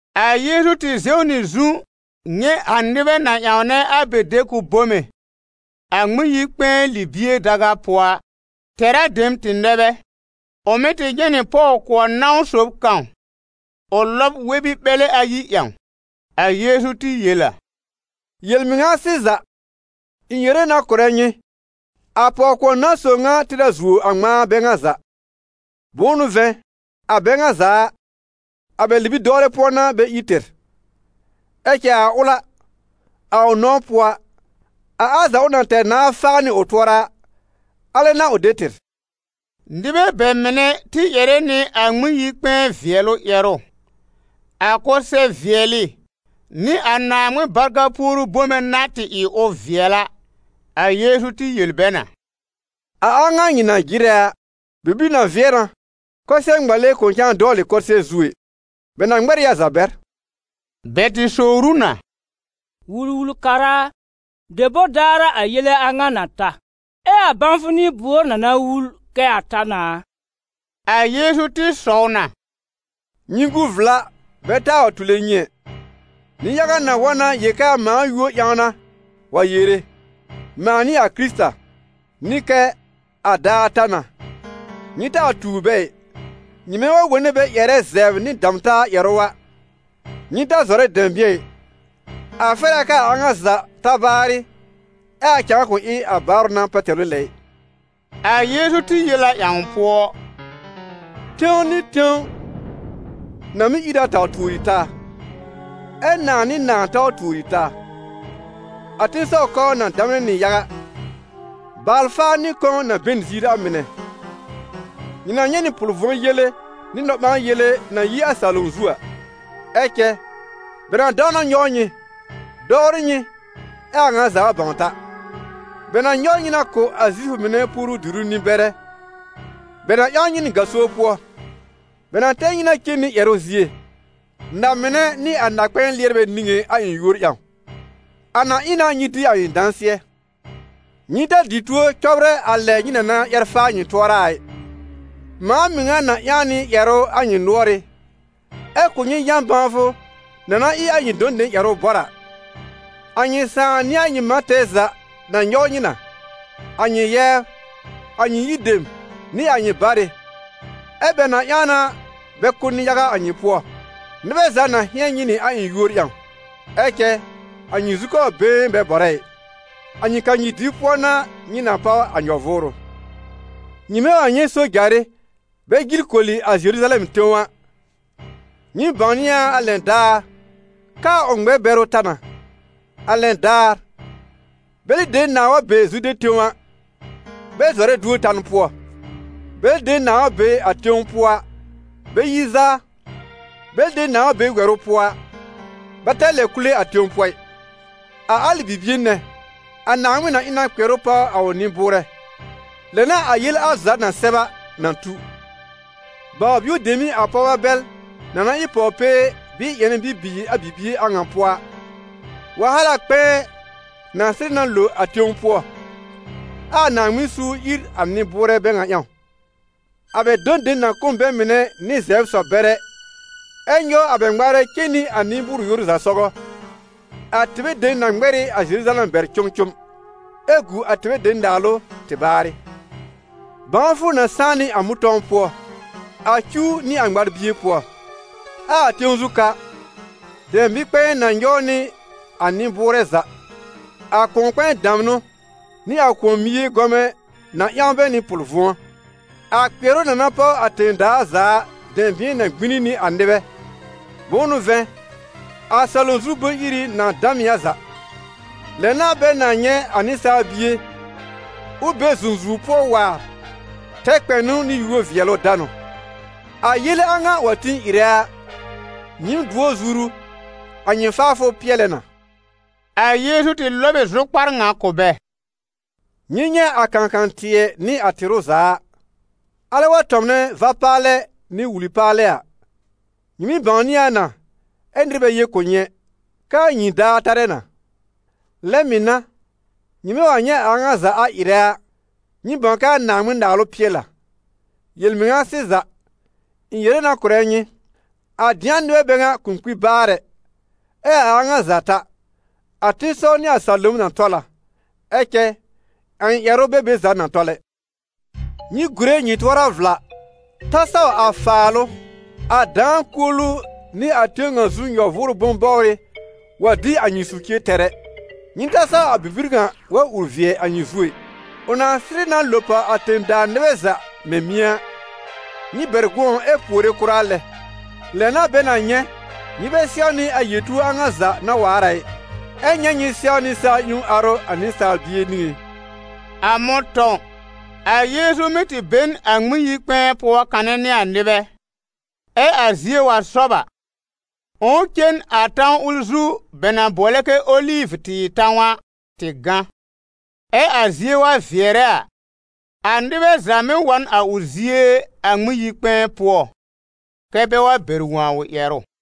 A Yeezu tɩ zɛw nɩ zu nyɛ̃ a nɩbɛ na ƴãwnɛ a bɛ de-kʋb bome a Ŋmɩn-yi-kpɛ̃ɛ libie daga pʋɔ a. Tɛra dem tɩ nɛ bɛ. Ʋ mɩ̀ tɩ nyɛ̃ nɩ pɔw-kʋɔr nãw sob kãw ʋ lɔb wɛr-bi-ɓɛlɛ ayi ƴãw. A Yeezu tɩ yel a: «Yel-mɩŋa sɩza, ɩ̃ yere na kʋ̀rɛ nyɩ, a pɔw-kʋɔr nãw sob ŋa tɩr a zuo a ŋmãa bɛ ŋa za. Bʋ̃ʋ n'ʋ vɛ̃, a bɛ ŋa za a, a bɛ libi-dɔwlɛ pʋɔ n'a bɛ ír tɩr. Ɛ cɛ a ʋl a, a ʋ nãw pʋɔ a, a al za ʋ na tɛr nãá faa nɩ ʋ tʋɔra a, alɛ n'a ʋ de tɩr.» Nɩbɛ bɛ mɩnɛ tɩ ƴɛrɛ nɩ a Ŋmɩn-yi-kpɛ̃ɛ vɩɛlʋ ƴɛrʋ, a kʋsɛ-vɩɛlɩ nɩ a Naaŋmɩn barka puoru bome na tɩ ɩ ʋ vɩɛl a. A Yeezu tɩ yel bɛ na: «A a ŋa nyɩ na jɩrɛ a, bibir na vɩɛ na kʋsɛ-ŋmale kʋ̃ cãa dɔwlɩ kʋsɩɛr zu ɛ, bɛ na ŋmɛr ɩ a za bɛr.» Bɛ tɩ sowr ʋ na: «Wul-wul-kara a, debor daar a, a yele a ŋa na ta? Ɛ a bãwfʋ n'ɩ buor na na wul kɛ a ta na a?» A Yeezu tɩ sɔw na: «Nyɩ gu vla bɛ taa wa tule nyɩ ɛ. Nɩ-yaga na wa na yel kɛ a mãa yúor ƴãw n'a, wa yere: ‹Mãa n'ɩ a Kɩrɩta›, nɩ kɛ: ‹A daar ta na.› Nyɩ taa tuur bɛ ɩ. Nyɩmɛ wa wone bɛ ƴɛrɛ zɛbr nɩ dam-taa ƴɛrʋ a, nyɩ ta zɔrɛ dɛ̃bɩ̃ɛ ɩ, a fɛr a kɛ a a ŋa za ta baarɩ, ɛ a cãa kʋ̃ ɩ a baarʋ n'a pɛtɛlʋ lɛ ɩ.» A Yeezu tɩ yel a ƴãw pʋɔ: «Tẽw nɩ tẽw na mɩ́ ìr a taw tuori taa, ɛ nãà nɩ nãà taw tuori taa. A tẽsɔw kɔbr na damnɛ nɩ yaga. Baal-faar nɩ kɔ̃ na be n a ziir a mɩnɛ. Nyɩ na nyɛ̃ nɩ pʋl-vʋ̃ɔ yele nɩ nɔ-ɓãa-yele na yi a salom zu a. Ɛ cɛ bɛ na dãw na nyɔw nyɩ, dɔwrɩ nyɩ, ɛ́ a a ŋa za bãw ta. Bɛ na nyɔw nyɩ na kʋ̀ a Zifʋ mɩnɛ puoru-diru nɩ-bɛrɛ. Bɛ na ƴãw nyɩ nɩ gaso pʋɔ, bɛ na tɛr nyɩ na cen nɩ ƴɛrʋ zie, na-mɩnɛ nɩ a na-kpɛ̃ɛ lɩɛrbɛ niŋé a ɩ̃ yúor ƴãw: a na ɩ na nyɩ dɩ a ɩ̃ dãsɩɛ. Nyɩ ta dɩ tuo cɔbrɛ a lɛ nyɩ na na ƴɛr faa nyɩ tʋɔra a ɩ. Mãa mɩŋa na ƴãw nɩ ƴɛrʋ a nyɩ nʋ́ɔrɩ́, ɛ kʋ̀ nyɩ yã-bãwfʋ na na ɩ a nyɩ dɔ̃ dem ƴɛrʋ bɔr a. A nyɩ sãà nɩ a nyɩ mã tɛɛ za na nyɔw nyɩ na, a nyɩ yɛbr, a nyɩ yir dem, nɩ a nyɩ barɩ, ɛ́ bɛ na ƴãw na bɛ kʋ́ nɩ-yaga a nyɩ pʋɔ. Nɩbɛ za na hɩ̃ɛn nyɩ nɩ a ɩ̃ yúor ƴãw. Ɛ cɛ a nyɩ zukɔbr been bɛ bɔrɛ ɩ. A nyɩ kanyir dɩb pʋɔ n'a nyɩ na páw a nyɔ-vʋʋrʋ.» «Nyɩmɛ wa nyɛ̃ sojarɩ bɛ jil koli a Zeruzalɛm tẽw a, nyɩ̃ɩm bãwnɩ a a lɛn daar kɛ a ʋ ŋmɛr-bɛrʋ ta na. A lɛn daar, bɛlɩ dem nãà wa be Zude tẽw a, bɛ zɔrɛ duor tan pʋɔ; bɛlɩ dem nãà wa be a tẽw pʋɔ a, bɛ yi zaa; bɛlɩ dem nãà wa be wɛrʋ pʋɔ a, bɛ ta lɛb kule a tẽw pʋɔ ɩ. A alɩ bibie nɛ, a Naaŋmɩn na ɩ na kpɩɛrʋ páw a ʋ nɩ-bʋʋrɛ. Lɛ n'a a yele al za na sɛb a, na tu. Baw-bio dem n'ɩ a pɔwbɛ bɛl na na ɩ pɔw-pee bɩɩ ƴɛnɛ bibiir a bibie a ŋa pʋɔ a; wahala kpɛ̃ɛ na sɩrɩ na lo a tẽw pʋɔ, ɛ a Naaŋmɩn suur ìr a nɩ-bʋʋrɛ bɛ ŋa ƴãw. A bɛ dɔ̃ dem na kʋ́ n bɛ mɩnɛ nɩ zɛbr-sɔ-bɛrɛ, ɛ́ nyɔw a bɛ ŋmaarɛ cen nɩ a nɩ-bʋʋr-yoru za sɔgɔ. A tɩbɛ dem na ŋmɛr ɩ a Zeruzalɛm bɛr cʋmcʋm, ɛ́ gu a tɩbɛ dem naalʋ tɩ baarɩ.» «Bãwfʋ na sãá nɩ a mʋ̃tɔ̃w pʋɔ, a cuw nɩ a ŋmar-bie pʋɔ. Ɛ a tẽw zu ka dɛ̃bɩ̃-kpɛ̃ɛ na nyɔw nɩ a nɩ-bʋʋrɛ za, a kʋ̃ɔ-kpɛ̃ɛ damnʋ nɩ a kʋ̃ɔ-mie gɔmɛ̃ na ƴãw bɛ nɩ pʋl-vʋ̃ɔ. A kpɩɛrʋ na na páw a tẽ-daa za a dɛ̃bɩ̃ɛ na gbĩni nɩ a nɩbɛ, bʋ̃ʋ n'ʋ vɛ̃, a salom zu bʋ̃-iri na dam ɩ a za. Lɛ na bɛ na nyɛ̃ a Nɩsaal Bie ʋ be zũzuwr pʋɔ waar, tɛr kpɛnʋ nɩ yúor-vɩɛlʋ-danʋ. A yele a ŋa wa tĩ ɩrɛ a, nyɩɩm dʋɔ zuru, a nyɩ faafʋ pɩɛlɛ na.» A Yeezu tɩ lɔb ɩ zʋkpar ŋa kʋ̀ bɛ: «Nyɩ nyɛ̃ a kãkã-tɩɛ nɩ a tɩrʋ za a; alɛ wa tɔ̃mnɛ va-paalɛ nɩ wuli paalɛ a, nyɩ mɩ́ bãwnɩ a na, ɛ nɩr bɛ yel kʋ̀ nyɩ ɛ, kɛ a nyĩi daar tarɛ na; lɛ mɩ̀ n'a, nyɩmɛ wa nyɛ̃ a a ŋa za a ɩrɛ a, nyɩ bãw kɛ a Naaŋmɩn-Naalʋ pɩɛl a. Yel-mɩŋa sɩza, ɩ̃ yere na kʋ̀rɛ nyɩ, a dɩ̃a nɩbɛ bɛ ŋa kʋ̃ kpi baar ɛ, ɛ a a ŋa za ta. A tẽsɔw nɩ a salom na tɔl a, ɛ cɛ a ɩ̃ ƴɛrʋ bɛ be za na tɔl ɛ.» «Nyɩ gùre nyɩ tʋɔra vla, ta saw a faalʋ, a dãa-kuolu nɩ a tẽw ŋa zu nyɔ-vʋʋrʋ bʋ̃-bɔbrɩ wa dĩ a nyɩ socie tɛr ɛ, nyɩ ta saw a bibir ŋa wa ur vɩɛ a nyɩ zu ɛ. Ʋ na sɩrɩ na lo pàw a tẽ-daa nɩbɛ za mɛ̃ mɩ̃ɛ a. Nyɩ bɛr gʋ̃ɔ ɛ puore kʋra lɛ: lɛ n'a bɛ na nyɛ̃, nyɩ bɛ sɛwnɩ a yel-tuor a ŋa za na waar a ɩ, ɛ nyɛ̃ nyɩ sɛwnɩ sa-ƴẽwn arʋ a Nɩsaal Bie niŋé.» A mʋ̃tɔ̃w, a Yeezu mɩ́ tɩ be n a Ŋmɩn-yi-kpɛ̃ɛ pʋɔ kanɛ nɩ a nɩbɛ; ɛ a zie wa sɔb a, ʋ̃ʋ cen a tãw ʋl zu bɛ na bʋɔlɛ kɛ Olivʋ-tɩɩr tãw a, tɩ gã. Ɛ a zie wa vɩɛrɛ a, a nɩbɛ za mɩ́ wa n a ʋ zie a Ŋmɩn-yi-kpɛ̃ɛ pʋɔ, kɛ́ bɛ wa bɛr wõ a ʋ ƴɛrʋ.